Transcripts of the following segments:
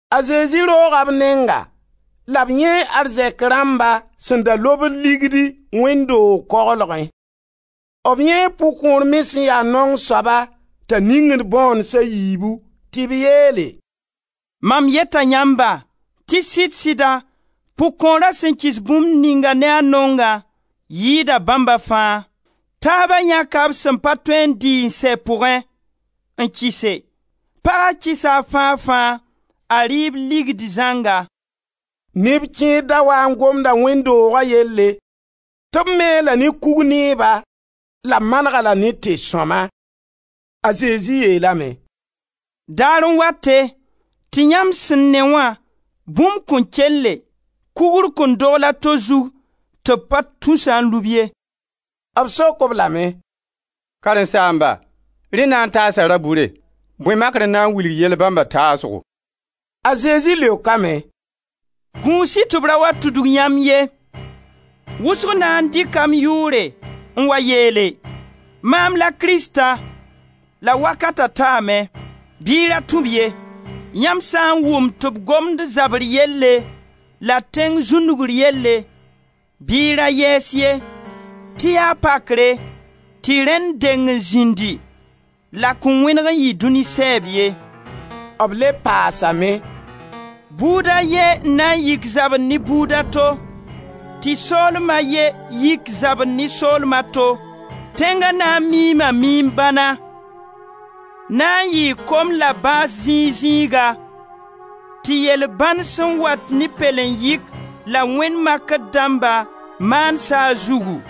A Zezi rooga b nenga la b yãee arzɛk rãmba sẽn da lobd ligdi wẽnd doog koglgẽ. B yãee pʋg-kõor me sẽn ya naong soaba t'a ningd bõones a yiibu. Tɩ b yeele: «Mam yeta yãmba tɩ sɩd-sɩda pʋg-kõora sẽn kɩs bũmb ninga ne a naongã yɩɩda bãmba fãa. Taaba yãka b sẽn pa tõe n dɩ n sɛ pʋgẽ n kɩse, paga kɩsa a fãa-fãa, a rɩɩb ligdi zãnga.» Neb kẽer da waa n gomda wẽnd dooga yelle tɩ b me-a-la ne kug-neeba, la b maneg-a-la ne te-sõma. A Zezi yeelame: «Daar n wate, tɩ yãmb sẽn ne wã, bũmb kõn kelle, kugr kõn dogl a to zug tɩ b pa tus-a n lub ye.» B sok-b lame: «Karen-saamba, rẽ na n taasa ra-bʋre? Bõe makr n na n wilg yell bãmba taasgo?» A Zezi leokame: «Gũus-y tɩ b ra wa tudg yãmb ye. Wʋsg na n dɩka m yʋʋre n wa yeele: ‹Maam la Krista!› ‹La wakata taame›; bɩ y ra tũ-b ye. Yãmb sã n wʋm tɩ b gomd zabr yelle la tẽng zũndugr yelle, bɩ y ra yɛɛs ye, tɩ yaa pakre tɩ rẽnd deng n zĩndi, la kõn wẽneg n yɩ dũni sɛɛb ye.» B le paasame: «Buud a ye n na n yik zabr ne buud a to, tɩ soolma a ye yik zabr ne soolma a to. Tẽnga na n miima miim-bãna, na n yɩɩ kom la bãas zĩig-zĩiga, tɩ yel-bãn sẽn wat ne pɛlen-yɩk la wẽnd makr dãmba maan saag zugu.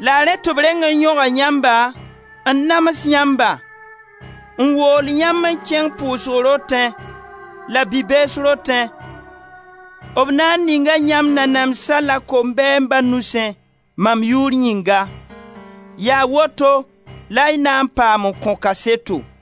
La rẽ tɩ b reng n yõga yãmba, n nams yãmba, n wool yãmb n kẽng pʋʋsg rotẽ la bi-bees rotẽ, b na n ninga yãmb nanamsã la kombɛɛmba nusẽ, mam yʋʋr yĩnga. Yaa woto la y na n paam n kõ kaseto.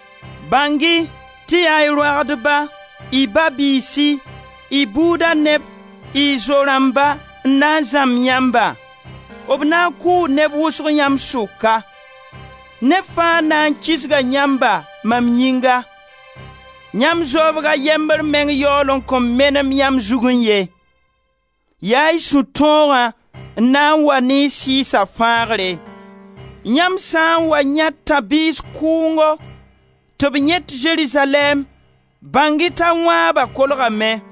Bãng-y tɩ yaa y roagdba, y ba-biisi, y buuda neb, y zo-rãmba, n na n zãmb yãmba; b na n kʋʋ neb wʋsg yãmb sʋka. Neb fãa na n kisga yãmba mam yĩnga. Yãmb zoobg a yembr meng yaool n kõn menem yãmb zugẽ ye. Yaa y sũ-tõogã n na n wa ne y sɩɩsa fãagre! Yãmb sã n wa yãe tãb-biis kʋʋngo tɩ b yẽt Zerizalɛɛm, bãng-y t'a wãaba kolgame.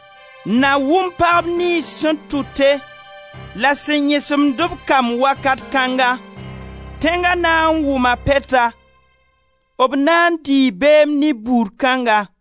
Na wʋm pagb niyns sẽn tʋte la sẽn yẽsemd b kamb wakat kãnga! Bu-zẽmba tʋʋm-beedo Tẽnga na n wʋma pɛta, b na n dɩɩ beem ne buud kãnga.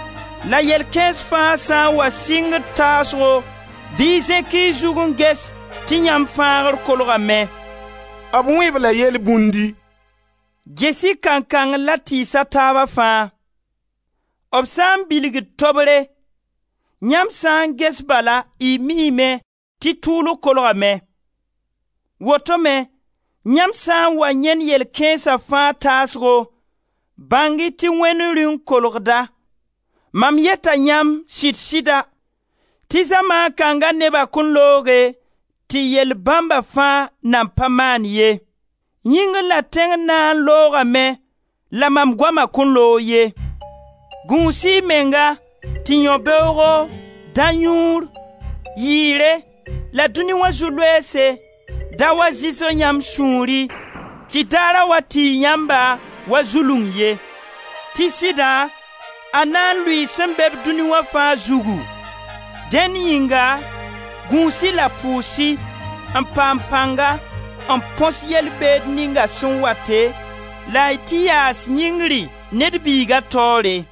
La yell kãens fãa sã n wa sɩngd taasgo bɩ y zẽk y zut n ges tɩ yãmb fãagr kolgame.» B wẽ-b-la yelbũndi: «Ges-y kankang la tɩɩs a taaba fãa. B sã n bilgd tobre, yãmb sã n ges bala y miime tɩ tʋʋlg kolgame. Woto me yãmb sa n wa yãend yɛl kãensa fãa taasgo, bãng-y tɩ Wẽnd Rĩung kolgda. Mam yeta yãmb, sɩd-sɩda, tɩ zamaan kãnga neba kõn looge tɩ yell bãmba fãa nan pa maan ye. Yĩngr la tẽng na n loogame, la mam goama kõn loog ye. Gũus-y y menga tɩ yão-beoogo, dã-yũur, yɩɩre la dũni wã zu-loeese da wa zɩsg yãmb sũuri tɩ Daara wa tiig yãmba, wa zulung ye; tɩ sɩda a na n lʋɩ sẽn be-b dũni wã fãa zugu. Dẽn yĩnga, gũus-y la pʋʋs-y, n paam pãnga n põs yel-beed ninga sẽn wate la y tɩ yaas yĩngri, Ned Biiga taoore.»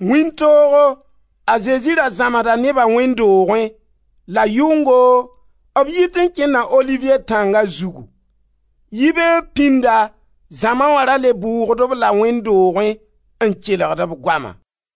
Wĩntoogo, a Zezi ra zãmsda neba wẽnd doogẽ la yʋngo, b yit n kẽnda Oliviye tãnga zugu. Yibeoog pĩnda zãma wa ra le bʋʋgd-b la wẽnd doogẽ n kelgd b goama.